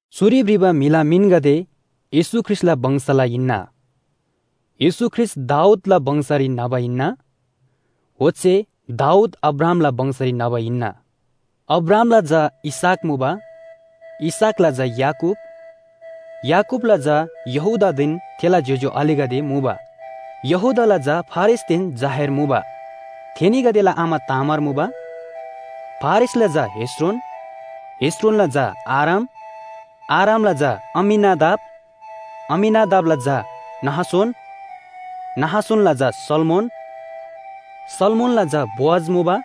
चुरी भ्रिबा म्‍हिला मिनगदे येशू ख्रीष्‍टला वंशला हिन्‍ना। येशू ख्रीष्‍ट दाऊदला वंशरी न्‍हबा हिन्‍ना, ओच्‍छे दाऊद अब्राहामला वंशरी न्‍हबा हिन्‍ना। अब्राहामला झा इसहाक मुबा, इसहाकला झा याकूब, याकूबला झा यहूदादेन थेला ज्‍योज्‍यो आलेगदे मुबा। यहूदाला झा फारेसदेन जाहेर मुबा। थेनीगदेला आमा तामार मुबा, फारेसला झा हेस्रोन, हेस्रोनला झा आराम, आरामला झा अम्‍मीनादाब, अम्‍मीनादाबला झा नहशोन, नहशोनला झा सल्‍मोन, सल्‍मोनला झा बोअज मुबा,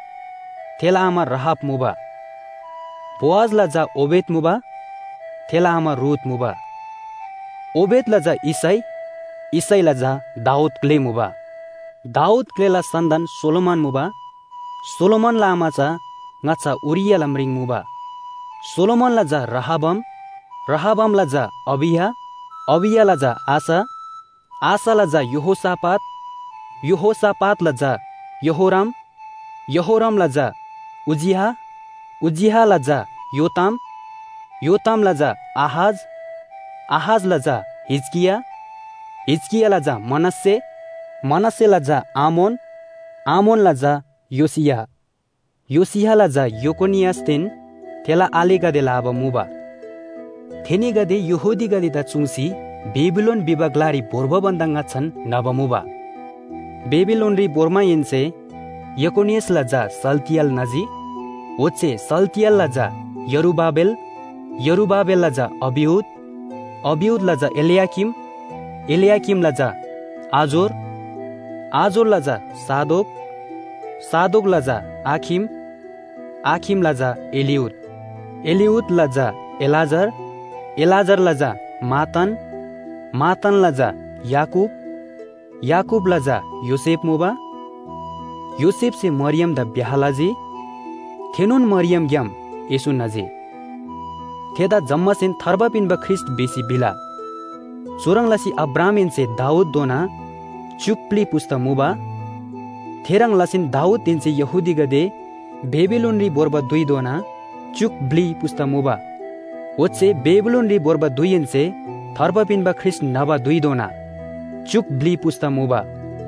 थेला आमा राहाब मुबा, बोअजला झा ओबेद मुबा, थेला आमा रूथ मुबा, ओबेदला झा यिशै, यिशैला झा दाऊद ग्‍ले मुबा, दाऊद ग्‍लेला सन्‍तान सोलोमन मुबा, सोलोमनला आमा चा ङाच्‍छा उरियाहला म्रिङ मुबा। सोलोमनला झा रहबाम, रहबामला झा अबिया, अबियाला झा आश, आशला झा यहोशापात, यहोशापातला झा यहोराम, यहोरामला झा उज्‍जियाह, उज्‍जियाहला झा योताम, योतामला झा आहाज, आहाजला झा हिजकिया, हिजकियाला झा मनश्‍शे, मनश्‍शेला झा आमोन, आमोनला झा योशियाह, योशियाहला झा यकोनियासदेन थेला आलेगदेला आबा मुबा। थेनीगदे यहूदीगदेदा चुङ्सी बेबिलोन भिबा ग्‍लारी भोर्बा भन्‍दा ङाच्‍छान न्‍हबा मुबा। बेबिलोनरी भोर्माहेन्‍से यकोनियासला झा शालतिएल न्‍हजी, ओच्‍छे शालतिएलला झा यरुबाबेल, यरुबाबेलला झा अबिउद, अबिउदला झा एल्‍याकीम, एल्‍याकीमला झा आजोर, आजोरला झा सादोक, सादोकला झा आखिम, आखिमला झा एलिउद, एलिउदला झा एलाजार, एलाजारला झा मत्तान, मत्तानला झा याकूब, याकूबला झा योसेफ मुबा, योसेफसे मरियमदा ब्‍याह लजी। थेनोन मरियमग्‍याम येशू न्‍हजी, थेदा जम्‍मासेन थार्बा पिन्‍बा ख्रीष्‍ट भिसी भिला। चुह्रङ् लसी अब्राहामहेन्‍से दाऊदधोना च्‍युक ब्‍लि पुस्‍ता मुबा, थेह्रङ् लसीन दाऊदहेन्‍से यहूदीगदे बेबिलोनरी भोर्बा धुइधोना च्‍युक ब्‍लि पुस्‍ता मुबा, ओच्‍छे बेबिलोनरी भोर्बा धुइहेन्‍से थार्बा पिन्‍बा ख्रीष्‍ट न्‍हबा धुइधोना च्‍युक ब्‍लि पुस्‍ता मुबा।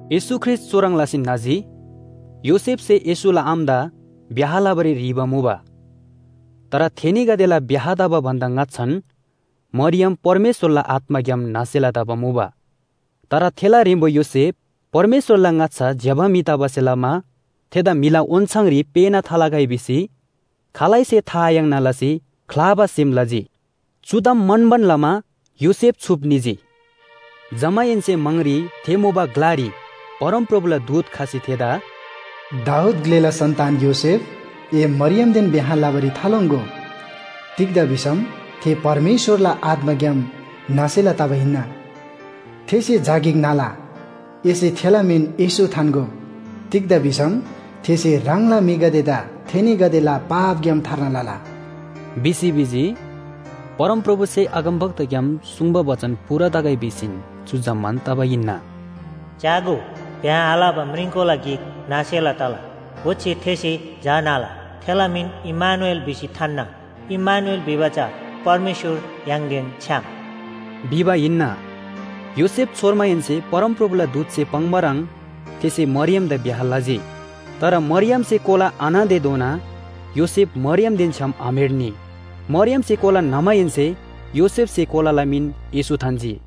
येशू ख्रीष्‍ट चुह्रङ् लसी न्‍हजी, योसेफसे येशूला आमादा ब्‍याह लबारी ह्रीबा मुबा। तर थेनीगदेला ब्‍याह तबा भन्‍दा ङाच्‍छान मरियम परमेश्‍वरला आत्‍माग्‍याम न्‍हसेला तबा मुबा। तर थेला ह्रेम्‍बो योसेफ परमेश्‍वरला ङाच्‍छा ज्‍यबा म्‍हि तबासे लमा थेदा म्‍हिला ओन्‍छाङरी पेःना थालगै भिसी खालैसे था आयाङ्ना लसी ख्‍लाबा सेम लजी। चु ताम म्‍हन्‍बान लमा योसेफ छुप निजी, जमाहेन्‍से म्‍हाङरी थे मुबा ग्‍लारी परमप्रभुला दूत खसी थेदा “दाऊद ग्‍लेला सन्‍तान योसेफ, ए मरियमदेन ब्‍याह लबारी थालोङ्‍गो। तिग्‍दा भिसम थे परमेश्‍वरला आत्‍माग्‍याम न्‍हसेला तबा हिन्‍ना। थेसे झा गिक न्‍हला, एसे थेला मिन येशू थान्‍गो। तिग्‍दा भिसम थेसे ह्राङला म्‍हिगदेदा थेनीगदेला पापग्‍याम थार्ना लला” भिसी भिजी। परमप्रभुसे अगमवक्ताग्‍याम सुङ्बा बचन पूरा तगै भिसीन चु जम्‍मान तबा हिन्‍ना। “च्‍यागो, ब्‍याह आलबा म्रिङकोला गिक न्‍हसेला तला ओच्‍छे थेसे झा न्‍हला, थेला मिन इम्‍मानुएल भिसी थान्‍ना,” इम्‍मानुएल भिबा चा “परमेश्‍वर य्‍हाङदेन छ्‌याम” भिबा हिन्‍ना। योसेफ छोर्माहेन्‍से परमप्रभुला दूतसे पाङ्बा ह्रङ् थेसे मरियमदा ब्‍याह लजी। तर मरियमसे कोला आन्‍हतेधोना योसेफ मरियमदेन छ्‌याम आम्‍हेर्नी। मरियमसे कोला न्‍हमाहेन्‍से योसेफसे कोलाला मिन येशू थान्‍जी।